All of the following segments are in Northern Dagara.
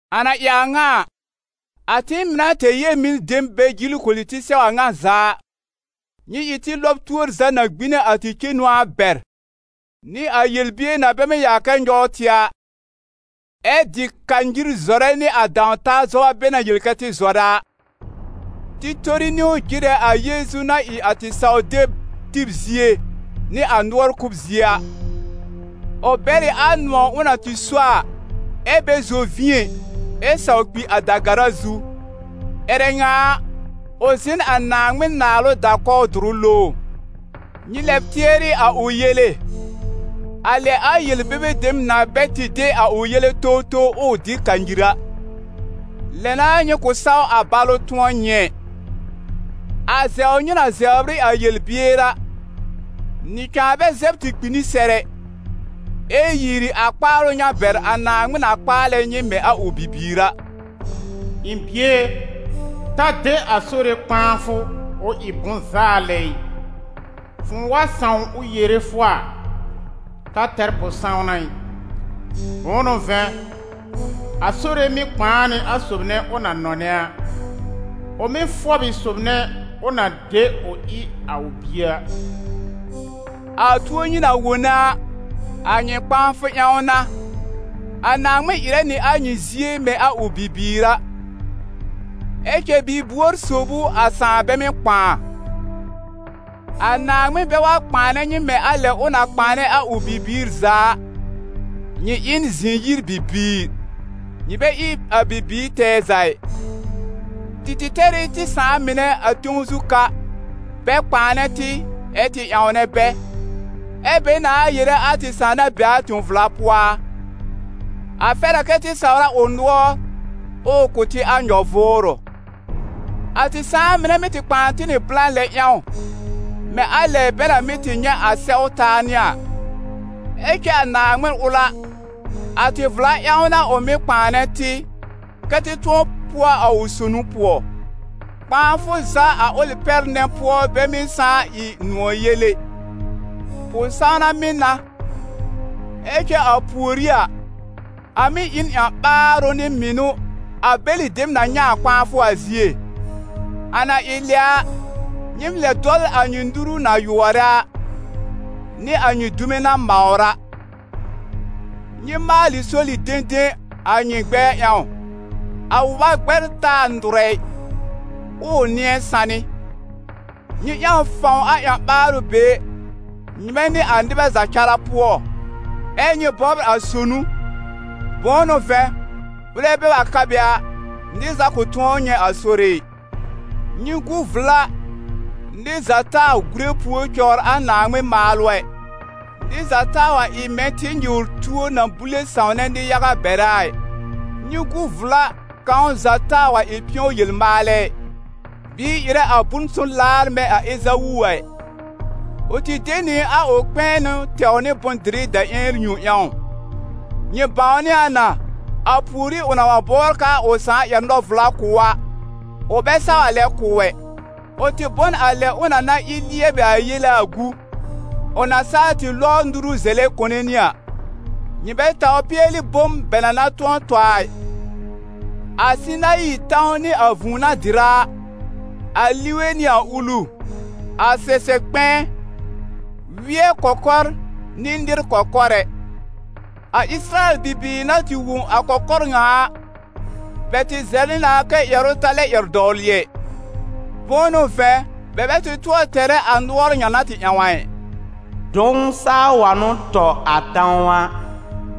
A na ɩ a ŋa a, a tɩɩm mɩ̀ na tɛr yel-mɩn dem bɛ jil koli tɩ sɛw a ŋa za a, nyɩ ɩ tɩ lɔb tuor za na gbine a tɩ cenu a bɛr, nɩ a yel-bier na bɛ mɩ́ yaa kɛ nyɔw tɩ a, ɛ dɩ kanyir zɔrɛ nɩ a dãw-taa zɔba bɛ na yel kɛ tɩ zɔrɛ a. Tɩ tori niwn jɩrɛ a Yeezu na ɩ a tɩ saw-deb tib zie nɩ a nʋɔr kʋb zie a. Ʋ bɛr ɩ a nʋ̃ɔ̀ ʋ na tɩ so a, ɛ bɛ zɔ vĩ ɛ, ɛ saw kpi a da-gara zu. Ƴɛrɛ ŋa a, ʋ zɩ̃ n a Naaŋmɩn naalʋ da-kɔw dʋrʋ lowr. Nyɩ lɛb tɩɛrɩ a ʋ yele, a lɛ a yel-bebe dem na bɛ tɩ de a ʋ yele towtow, ʋʋ dɩ kanyir a. Lɛ n'a nyɩ kʋ̃ saw a balʋ tʋ̃ɔ nyɩ ɛ. A zɛbr nyɩ na zɛbr ɩ a yel-bier a, nyɩ cãa bɛ zɛb tɩ kpi n sɛr ɛ, ɛ yiiri a kpaalʋ ŋa bɛr a Naaŋmɩn na kpaalɛ nyɩ mɛ̃ a ʋ bibiir a: «Ɩ̃ bie e, ta de a Sore kpãafʋ ʋ ɩ bʋ̃-zaa lɛ ɩ, fʋ̃ʋ wa sãw ʋ yere fʋ a, ta tɛr pʋ-sãwna ɩ. Bʋ̃ʋ n'ʋ vɛ̃, a Sore mɩ́ kpãa nɩ a sob nɛ ʋ na nɔnɛ a, ʋ mɩ́ fɔb ɩ sob nɛ ʋ na de ʋ ɩ a ʋ bie a.» A tuo nyɩ na wone a, a nyɩ kpãafʋ ƴãw n'a. A Naaŋmɩn ɩrɛ nɩ a nyɩ zie mɛ̃ a ʋ bibiir a. Ɛ cɛ bi-buor sob ʋ a sãà bɛ mɩ́ kpãa? A Naaŋmɩn bɛ wa kpãanɛ nyɩ mɛ̃ a lɛ ʋ na kpãanɛ a ʋ bibiir za a, nyɩ ɩ n zɩ̃-yir-bibiir, nyɩ bɛ ɩ a bibiir tɛɛ za ɩ. Tɩ tɩ tɛr ɩ a tɩ sãà mɩnɛ a tẽw zu ka, bɛ kpãanɛ tɩ, ɛ́ tɩ ƴãwnɛ bɛ; ɛ́ bɛ nãa yere a tɩ Sãà na be a tẽ-vla pʋɔ a? A fɛr a kɛ tɩ sawr a ʋ nʋɔr, ʋʋ kʋ̀ tɩ a nyɔ-vʋʋrʋ. A tɩ sãà mɩnɛ mɩ́ tɩ kpãa tɩ nɩ blã lɛ ƴãw, mɛ̃ a lɛ bɛ na mɩ́ tɩ nyɛ̃ a sɛw taa nɩ a. Ɛ cɛ a Naaŋmɩn ʋl a, a tɩ vla ƴãw n'a ʋ mɩ́ kpãanɛ tɩ, kɛ́ tɩ tʋ̃ɔ pʋɔ a ʋ sonu pʋɔ. Kpãafʋ za a ʋlɩ pɛr nɛ pʋɔ bɛ mɩ́ sãá ɩ nʋ̃ɔ̀ yel ɛ, pʋ-sãwna mɩ́ n'a. Ɛ cɛ a pùorí a, a mɩ́ ɩ n ƴã-ɓaarʋ nɩ mɩnʋ a bɛlɩ dem na nyɛ̃ a kpãafʋ a zie. A na ɩ lɛ a, nyɩ lɛb dɔl a nyɩ nuru na yʋɔrɛ a, nɩ a nyɩ dume na mawr a. Nyɩ maalɩ soli-dẽdẽ a nyɩ gbɛ̃ɛ ƴãw, a wʋba gbɛr taa nʋrɛ ɩ, ʋʋ nɩ̃ɛ sanɩ. Nyɩ ƴãw fãw a ƴã-ɓaarʋ be nyɩmɛ nɩ a nɩbɛ za cara pʋɔ, ɛ nyɩ bɔbr a sonu, bʋ̃ʋ n'ʋ vɛ̃, ʋlɛ bɛ wa ka be a, nɩr za kʋ̃ tʋ̃ɔ nyɛ̃ a Sore ɩ. Nyɩ gu vla nɩr za taa gùre pùor cɔwr a Naaŋmɩn maalʋ ɛ, nɩr za taa wa ɩ mɛ̃ tɩ-nyɩwr-tuo na bule sãwnɛ nɩ-yaga bɛrɛ a ɩ. Nyɩ gu vla kãw za taa wa ɩ pɩ̃ɔ-yel-maalɛ ɩ, bɩɩ ɩrɛ a bʋ̃-son laar mɛ̃ a Ezawu a ɩ; ʋ tɩ de nɩ a ʋ kpɛ̃ɛnʋ tɛw nɩ bʋ̃-dɩrɩ daƴẽn yõ ƴãw. Nyɩ bãwnɩ a na, a pùorí ʋ na wa bɔbr k'aa ʋ sãà ƴɛr nɔ-vla kʋ̀ ʋ a, ʋ bɛ saw a lɛ kʋ̀ ʋ ɛ. Ʋ tɩ bɔ n a lɛ ʋ na na ɩ lɩɛbɩ a yele a gu, ʋ na saa tɩ lɔbr nuru zɛlɛ kone nɩ a. Nyɩ bɛ taw pɩɛlɩ bom bɛ na na tʋ̃ɔ tɔ a ɩ, a Sɩnayi tãw nɩ a ʋ vũu na dɩrɛ a, a lige nɩ a ulu, a sɛsɛb kpɛ̃ɛ, wɩɛ kɔkɔr nɩ nɩr kɔkɔr ɛ. A Ɩsɩrayɛl bibiir na tɩ wõ a kɔkɔr ŋa a, bɛ tɩ zɛlɛ na kɛ́ ƴɛrʋ ta lɛ ƴɛr dɔwlɩ ɛ. Bʋ̃ʋ n'ʋ vɛ̃, bɛ bɛ tɩ tʋɔr tɛrɛ a nʋɔr ŋa na tɩ ƴãw a ɩ: «Dʋ̃w saa wa n'ʋ tɔ a tãw a,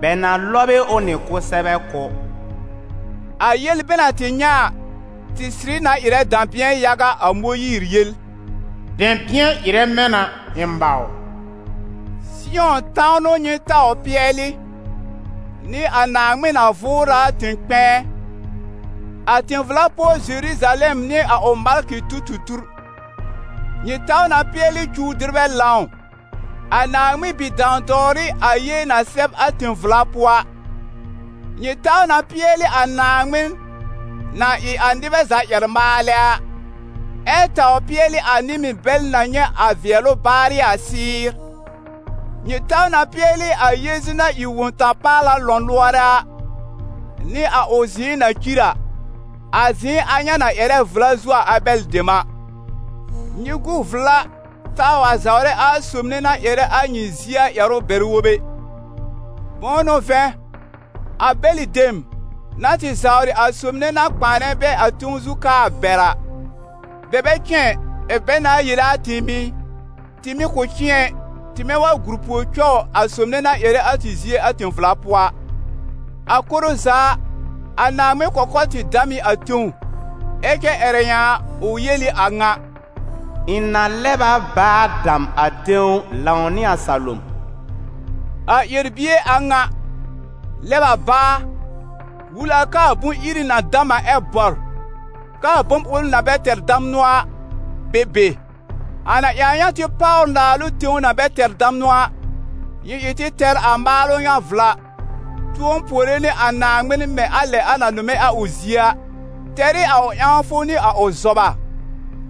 bɛ na lɔb ɩ ʋ nɩ kʋsɛbɛ kʋ́.» A yel bɛ na tɩ nyɛ̃ a, tɩ sɩrɩ na ɩrɛ dɛ̃bɩ̃ɛ yaga, a Mõyiir yel: «Dɛ̃bɩ̃ɛ ɩrɛ mɛ̃ na, ɩ̃ mawr.» Sɩyɔ̃ tãw n'ʋ nyɩ taw pɩɛlɩ, nɩ a Naaŋmɩn na vʋʋrɛ a tẽ-kpɛ̃ɛ, a tẽ-vla pʋɔ Zeruzalɛm nɩ a ʋ malkɩ tu-tu-tur. Nyɩ taw na pɩɛlɩ cuw-dɩrbɛ lãw, a Naaŋmɩn bi-dãw-dɔwrɩ, a yee na sɛb a tẽ-vla pʋɔ a. Nyɩ taw na pɩɛlɩ a Naaŋmɩn, na ɩ a nɩbɛ za ƴɛr-maalɛ a, ɛ taw pɩɛlɩ a nɩ-mɩn bɛl na nyɛ̃ a vɩɛlʋ baarɩ a sɩ́ɩr. Nyɩ taw na pɩɛlɩ a Yeezu na ɩ Wõ-ta-paala lɔ̃lʋɔrɛ a, nɩ a ʋ zɩ̃ɩ na cir a, a zɩ̃ɩ a ŋa na ƴɛrɛ vla zuo a Abɛl dem a. Nyɩ gu vla taa wa zawrɛ a sob nɛ na ƴɛrɛ a nyɩ zie a ƴɛrʋ bɛr-wob ɛ. Bʋ̃ʋ n'ʋ vɛ̃, a bɛlɩ dem, na tɩ zawrɩ a sob nɛ na kpãanɛ bɛ a tẽw zu ka a bɛr a, bɛ bɛ cɩ̃ɛ ɩ, ɛ̀ bɛ nãa yere a tɩɩm ɩ, tɩ mɩ̀ kʋ̃ cɩ̃ɛ ɩ, tɩmɛ wa gur pùor cɔw a sob nɛ na ƴɛrɛ a tɩ zie a tẽ-vla pʋɔ a. A koro za a, a Naaŋmɩn kɔkɔr tɩ dam ɩ a tẽw, ɛ cɛ ƴɛrɛ ŋa a, ʋ yel ɩ a ŋa: «Ɩ̃ na lɛb a báa dam a tẽw lãw nɩ a salom.» A ƴɛr-bie a ŋa: «lɛb a báa» wul a k'aa bʋ̃-iri na dam a ɛ bɔr, k'aa bom ʋl na bɛ tɛr damnʋ a be be. A na ɩ a ŋa tɩ páwr naalʋ tẽw na bɛ tɛr damnʋ a, nyɩ ɩ tɩ tɛr a maalʋ ŋa vla, tʋ̃ɔ puore nɩ a Naaŋmɩn mɛ̃ a lɛ a na nʋmɛ a ʋ zie a, tɛr ɩ a ʋ ƴãwfʋ nɩ a ʋ zɔba.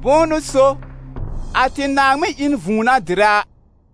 Bʋ̃ʋ n'ʋ so, a tɩ Naaŋmɩn ɩ n vũu na dɩrɛ a.